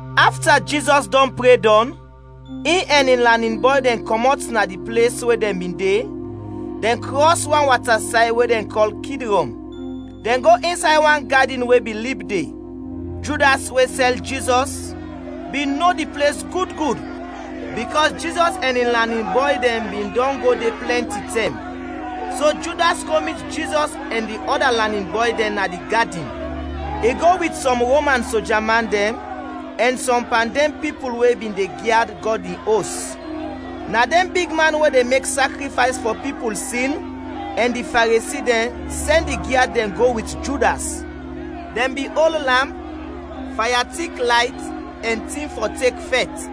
Afta Jizɔs dɔn pre dɔn, in ɛn in lanin bɔy dɛn kɔmɔt na di ples we dɛn bin de, dɛn krɔs wan watasay we dɛn kɔl Kidrɔn. Dɛn go insay wan gadin we bin lib de. Judas, we sɛl Jizɔs, bin no di ples gud gud, bikɔs Jizɔs ɛn in lanin bɔy dɛn bin dɔn go de plɛnti tɛm. So Judas go mit Jizɔs ɛn di ɔda lanin bɔy dɛn na di gadin. I go wit sɔm Roman soja man dɛn ɛn sɔm pan dɛn pipul we bin de gyad Gɔd in Os. Na dɛn bigman we de mek sakrifays fɔ pipul sin ɛn di Faresi dɛn sɛn di gyad dɛn go wit Judas. Dɛn bin ol lamp, faya tik layt, ɛn tin fɔ tek fɛt.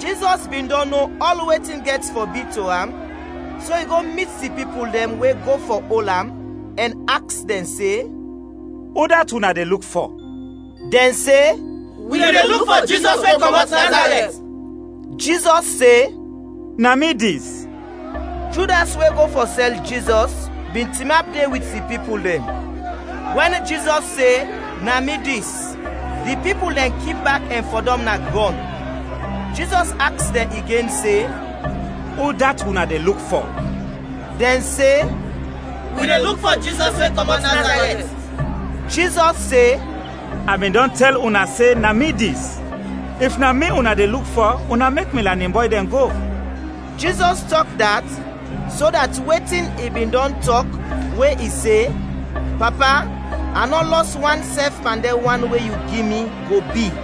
Jizɔs bin dɔn no ɔl wetin gɛt fɔ bi to am, so i go mit di pipul dɛn we go fɔ ol am, ɛn aks dɛn se, “Udat una de luk fɔ?” Dɛn se, “Wi de luk fɔ Jizɔs we kɔmɔt Nazarɛt.” Jizɔs se, “Na mi dis.” Judas, we go fɔ sɛl Jizɔs, bin tinap de wit di pipul dɛn. Wɛn Jizɔs se, “Na mi dis,” di pipul dɛn kip bak ɛn fɔdɔm na grɔn. Jizɔs aks dɛn igen se, “Udat una de luk fɔ?” Dɛn se, “Wi de luk fɔ Jizɔs we kɔmɔt Nazarɛt.” Jizɔs se, “A bin dɔn tɛl una se, ‘Na mi dis,’ if na mi una de luk fɔ, una mek mi lanin bɔy dɛn go.” Jizɔs tɔk dat, so dat wetin i bin dɔn tɔk we i se: “Papa, a nɔ lɔs wan sɛf pan dɛn wan we yu gi mi,” go bi.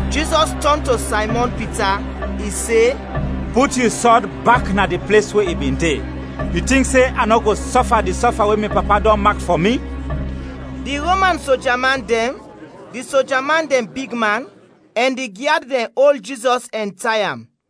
Jizɔs tɔn to Saymɔn Pita, i se, “Put yu sɔd bak na di ples we i bin de! Yu tink se a nɔ go sɔfa di sɔfa we mi Papa dɔn mak fɔ mi?” Di Roman sojaman dɛn, di soja man dɛn bigman, ɛn di gyad dɛn ol Jizɔs ɛn tay am,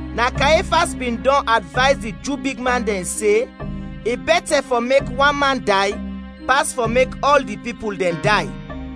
Na Kayefas bin dɔn advays di Ju bigman dɛn se i bɛtɛ fɔ mek wan man day, pas fɔ mek ɔl di pipul dɛn day.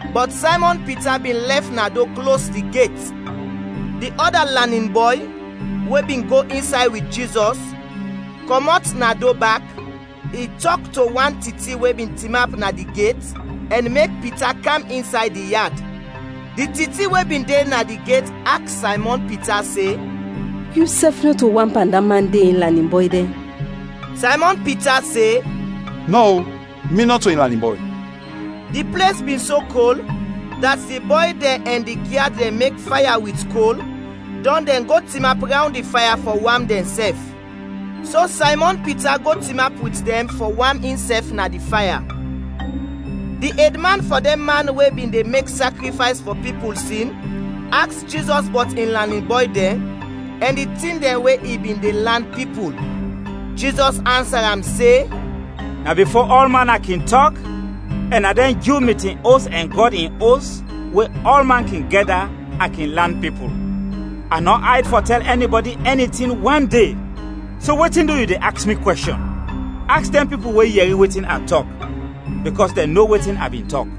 Bɔt Saymɔn Pita bin lɛf na do klos di get. Di ɔda lanin bɔy, we bin go insay wit Jizɔs, kɔmɔt na do bak, i tɔk to wan titi we bin tinap na di get, ɛn mek Pita kam insay di yad. Di titi we bin de na di get aks Saymɔn Pita se, “Yusɛf nɔto wan pan da man de in lanin bɔy dɛn?” Saymɔn Pita se, “Nɔ-o, mi nɔto in lanin bɔy!” Di ples bin so kɔl, dat di bɔy dɛn ɛn di gyad dɛn mek faya wit kol, dɔn dɛn go tinap rawnd di faya fɔ wam dɛnsɛf. So Saymɔn Pita go tinap wit dɛn fɔ wam insɛf na di faya. Di edman fɔ dɛn man we bin de mek sakrifays fɔ pipul sin aks Jizɔs bɔt in lanin bɔy dɛn ɛn di tin dɛn we i bin de lan pipul. Jizɔs ansa am se, “Na bifo ɔlman a kin tɔk, ɛn na dɛn Ju mitin os ɛn Gɔd in Os, we ɔlman kin gɛda, a kin lan pipul. A nɔ ayd fɔ tɛl ɛnibɔdi ɛni tin wande. So, wetin du yu de aks mi kwɛshɔn? Aks dɛn pipul we yɛri wetin a tɔk, bikɔs dɛn no wetin a bin tɔk.”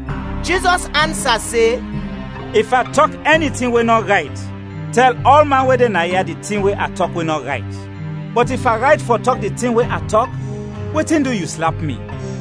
Jizɔs ansa se, “If a tɔk ɛni tin we nɔ rayt, tɛl ɔlman we de naya di tin we a tɔk we nɔ rayt. Bɔt if a rayt fɔ tɔk di tin we a tɔk, wetin du yu slap mi?”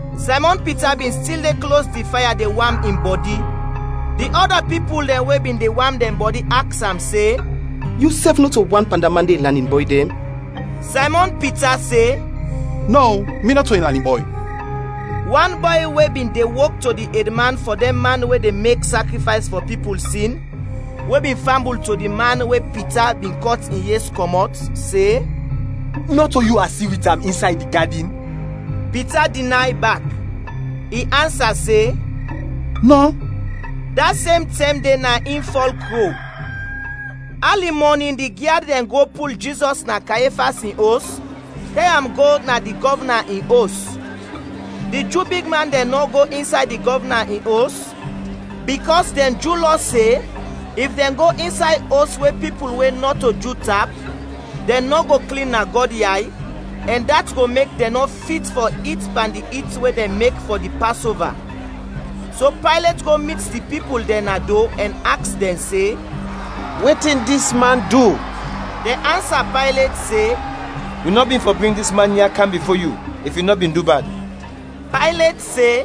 Saymɔn Pita bin stil de klos di faya de wam in bɔdi. Di ɔda pipul dɛn we bin de wam dɛn bɔdi aks am se, “Yusɛf nɔto wan pan da man de in lanin bɔy dɛn?” Saymɔn Pita se, “Nɔ-o, mi nɔto in lanin bɔy!” Wan bɔy we bin de wok to di edman fɔ dɛn man we de mek sakrifays fɔ pipul sin we bin fambul to di man we Pita bin kɔt in yes kɔmɔt, se, “Nɔto yu a si wit am insay di gadin?” Pita dinay bak. I ansa se, “Nɔ!” Da sem tɛm de na in fɔl kro. Ali mɔnin di gyad dɛn go pul Jizɔs na Kayefas in os kɛr am go na di gɔvna in os. Di Ju bigman dɛn nɔ go insay di gɔvna in os, bikɔs dɛn Ju Lɔ se if dɛn go insay os we pipul we nɔto Ju tap, dɛn nɔ go klin na Gɔd yay, ɛn dat go mek dɛn nɔ fit fɔ it pan di it we dɛn mek fɔ di Pasova. So Paylet go mit di pipul dɛn na do ɛn aks dɛn se, “Wetin dis man du?” Dɛn ansa Paylet se, “Wi nɔ bin fɔ bring dis man ya kam bifo yu if i nɔ bin du bad.” Paylet se,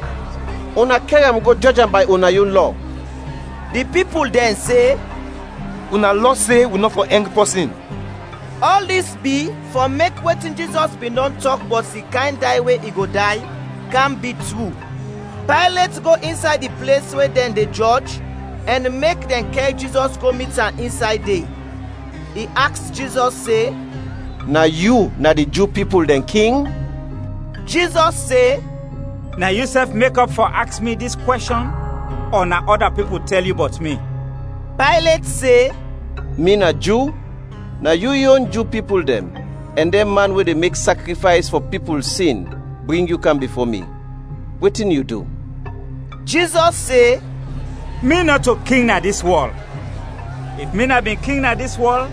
“Una kɛr am go jɔj am bay una yon lɔ.” Di pipul dɛn se, “Una lɔ se wi nɔ fɔ ɛng pɔsin.” (Ɔl dis bi fɔ mek wetin Jizɔs bin dɔn tɔk bɔt di kayn day we i go day, kam bi tru.) Paylet go insay di ples we dɛn de jɔj ɛn mek dɛn kɛr Jizɔs go mit am insay de. I aks Jizɔs se, “Na yu na di Ju pipul dɛn King?” Jizɔs se, “Na yusɛf mekɔp fɔ aks mi dis kwɛshɔn ɔ na ɔda pipul tɛl yu bɔt mi?” Paylet se, “Mi na Ju? Na yu yon Ju pipul dɛn ɛn dɛn man we de mek sakrifays fɔ pipul sin bring yu kam bifo mi. Wetin yu du?” Jizɔs se, “Mi nɔto King na dis wɔl, if mi na bin King na dis wɔl,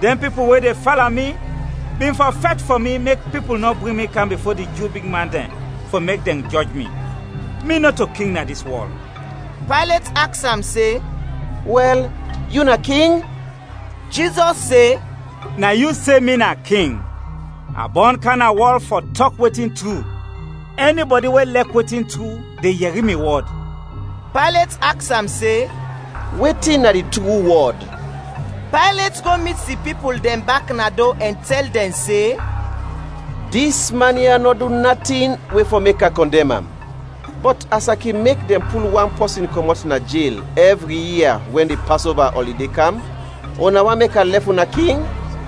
dɛn pipul we de fala mi bin fɔ fɛt fɔ mi mek pipul nɔ bring mi kam bifo di Ju bigman dɛn fɔ mek dɛn jɔj mi. Mi nɔto King na dis wɔl.” Paylet aks am se, “Wɛl, yu na King?” Jizɔs se, “Na yu se mi na King. A bɔn kam na wɔl fɔ tɔk wetin tru. Ɛnibɔdi we lɛk wetin tru de yɛri mi wɔd.” Paylet aks am se, “Wetin na di tru wɔd?” Paylet go mit di pipul dɛn bak na do ɛn tɛl dɛn se, “Dis man ya nɔ du natin we fɔ mek a kɔndɛm am. Bɔt as a kin mek dɛn pul wan pɔsin kɔmɔt na jel ɛvri ia wɛn di Pasova ɔlide kam, una want mek a lɛf una King?”